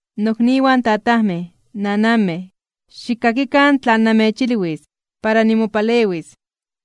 ―Nokniwan tatajmej, nananmej, xikkakikan tlan namechilwis para nimopalewis.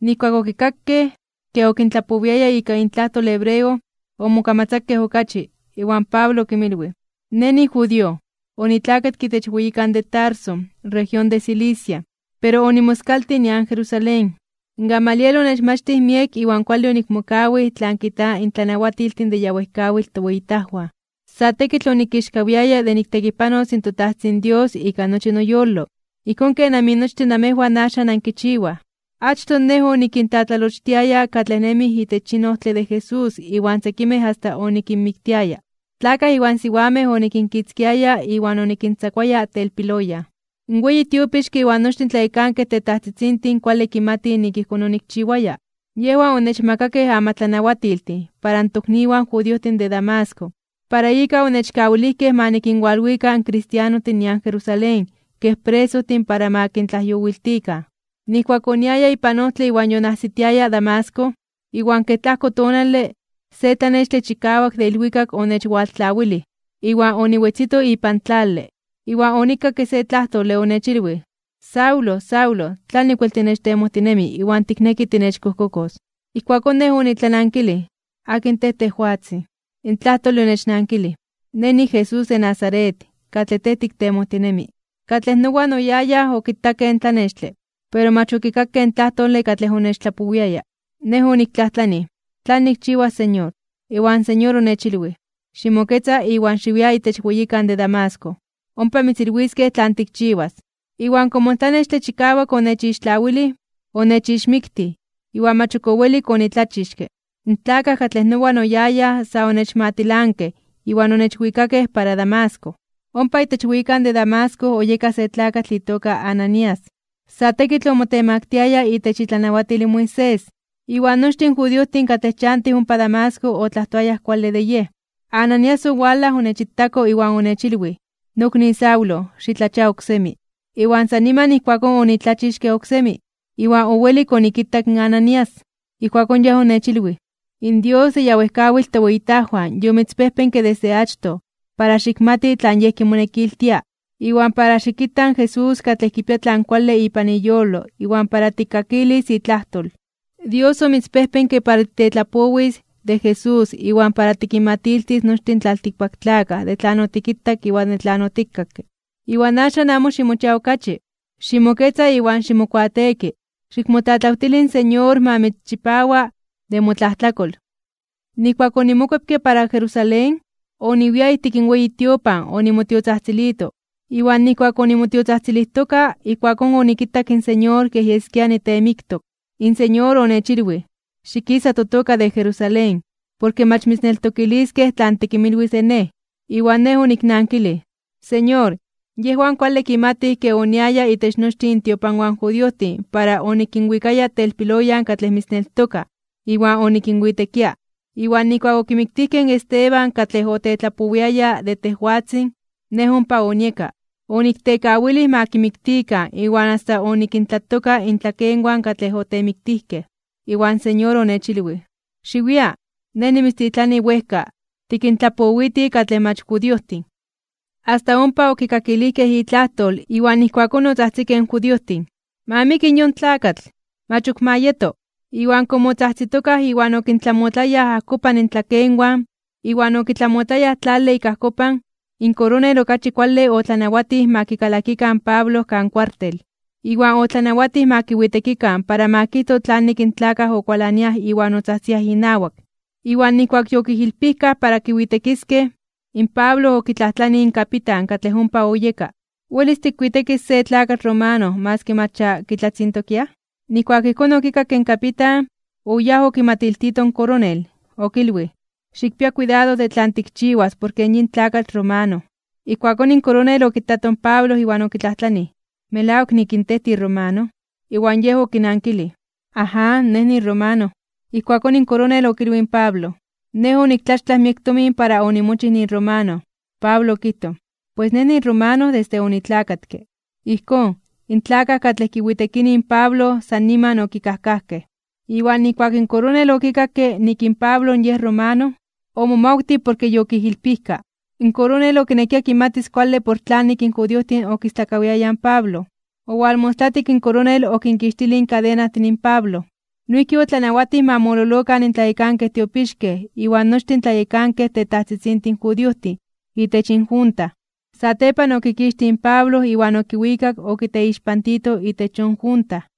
Nijkuak okikakej ke okintlapowiaya ika intlajtol hebreo, omokamatzakej okachi. Iwan Pablo okinmilwij: ―Nej nijudío. Onitlakatke itech weyikan de Tarso, región de Cilicia, pero onimoskaltij nian Jerusalén. Gamaliel onechmachtij miek iwan kuale onikmokawij tlan kijtaj in tlanawatiltin de ya wejkawitl toweyitajwan. Sa tekitl onikixkawiaya (onimomelij) de niktekipanos in toTajtzin Dios ika nochi noyolo, ijkón ken aminochtin namejwan axan ankichiwaj. Achtoj nej onikintlatlalochtiaya katlej nemij itech yin ojtle de Jesús iwan sekimej asta onikinmiktiaya. Tlakaj iwan siwamej onikinkitzkiaya iwan onikintzakuaya telpiloyan. In weyi tiopixke iwan nochtin in tlayekankej tetajtzitzintin kuale kimatij nik ijkón onikchiwaya. Yejwan onechmakakej amatlanawatiltin para in tokniwan judiojtin de Damasco, para ika onechkawilijkej ma nikinwalwika in kristianostin nian Jerusalén kej presojtin para ma kintlajyowiltikan. ’Nijkuak oniaya ipan ojtle iwan yonajsitiaya Damasco, iwan kej tlajko tonale, se tlanextle chikawak de ilwikak onechwaltlawilij iwan oniwetzito ipan tlale. Iwan onikakke se tlajtole, onechilwij: “Saulo, Saulo, ¿tlanik wel tinechtemojtinemi iwan tikneki tinechkojkokos?” Ijkuakón nej onitlanankilij: “¿Akin tej, tejwatzin?” In tlajtole onechnankilij: “Nej niJesús de Nazaret, katlej tej tiktemojtinemi.” Katlej nowan oyayaj okitakej in tlanextle, pero mach okikakej in tlajtole katlej onechtlapowiaya. Nej oniktlajtlanij: “¿Tlan nikchiwas, Señor?” Iwan Señor onechilwij: “Ximoketza iwan xiwia itech weyikan de Damasco. Ompa mitzilwiskej tlan tikchiwas.” Iwan komo in tlanextle chikawak onechixtlawilij, onechixmiktij, iwan mach ok owelik onitlachixke, in tlakaj katlej nowan oyayaj sa onechmatilankej iwan onechwikakej para Damasco. ’Ompa itech weyikan de Damasco oyeka se tlakatl itoka Ananías, sa tekitl omotemaktiaya itech itlanawatil in Moisés, iwan nochtin in judiojtin katlej chantij ompa Damasco otlajtoayaj kuale de yej. Ananías owalaj onechitako iwan onechilwij: “Nokni Saulo, xitlachia oksemi.” Iwan san niman ijkuakón onitlachixke oksemi, iwan owelik onikitak in Ananías. Ijkuakón yej onechilwij: “In Dios de ya wejkawitl toweyitajwan yomitzpejpenke desde achtoj para xikmati tlan Yej kimonekiltia, iwan para xikita in Jesús katlej kipia tlan kuale ipan iyolo iwan para tikkakilis itlajtol. Dios omitzpejpenke para titetlapowis de Jesús iwan para tikinmatiltis nochtin in tlaltikpaktlakaj de tlan otikitak iwan de tlan otikakke. Iwan axan, amo ximochia okachi. Ximoketza iwan ximokuateeki. Xikmotlatlawtili in Señor ma mitzchipawa de motlajtlakol.” ’Nijkuak onimokuepke para Jerusalén, oniwia ijtik in weyi tiopan onimotiotzajtzilito. Iwan nijkuak onimotiotzajtzilijtoka ijkuakón onikitak in Señor kej yeskia niteemiktok. In Señor onechilwij: “Xikisa totoka de Jerusalén, porke mach mitzneltokiliskej tlan tikinmilwis de Nej.” Iwan nej oniknankilij: “Señor, yejwan kuale kimatij ke oniaya itech nochtin intiopanwan in judiojtin para onikinwikaya telpiloyan katlej mitzneltokaj, iwan onikinwitekia. Iwan nijkuak okimiktijkej in Esteban katlej otetlapowiaya de tejwatzin, nej ompa onieka, oniktekawilij ma kimiktikan iwan asta onikintlatoka intlakenwan katlej otemiktijkej.” Iwan Señor onechilwij: “¡Xiwia! Nej nimitztitlanis wejka, tikintlapowiti katlej mach judiojtin.” Asta ompa okikakilijkej itlajtol, iwan ijkuakón otzajtzikej in judiojtin: ―¡Ma miki yon tlakatl! ¡Mach ok ma yeto! Iwan komo otzajtzitokaj iwan okintlamotlayaj ajkopan intlakenwan iwan okitlamotlayaj tlale ik ajkopan, in koronel okachi kuale otlanawatij ma kikalakikan in Pablo kan kuartel. Iwan otlanawatij ma kiwitekikan para ma kijto tlanik in tlakaj okualaniaj iwan otzajtziaj inawak. Iwan nijkuak yokijilpijkaj para kiwitekiskej, in Pablo okitlajtlanij in kapitan katlej ompa oyeka: ―¿Welis tikwitekis se tlakatl romano maski mach ya kitlatzintokiaj? Nijkuak ijkón okikakke in kapitan, oyáj okimatiltito in koronel. Okilwij: ―Xikpia kuidado de tlan tikchiwas porke yin tlakatl romano. Ijkuakón in koronel okitato in Pablo iwan okitlajtlanij: ―¿Melawak nik in tej tiromano? Iwan yej okinankilij: ―Aján, nej niromano. Ijkuakón in koronel okilwij in Pablo: ―Nej oniktlaxtlaj miek tomin para onimochij niromano. Pablo okijtoj: ―Pues nej niromano desde onitlakatke. Ijkón, in tlakaj katlej kiwitekinij in Pablo san niman okikajkajkej. Iwan nijkuak in koronel okikakke nik in Pablo yej romano, omomawtij porke yokijilpijka. In koronel okinekia kimatis kuale por tlanik in judiojtin okistlakawiayaj in Pablo. Owalmostlatik in koronel okinkixtilij in kadenajtin in Pablo. Noijki otlanawatij ma mololokan in tlayekankej tiopixkej iwan nochtin tlayekankej tetajtzitzintin judiojtin itech injunta. Satepan okikixtij in Pablo iwan okiwikak okiteixpantito itech yon junta.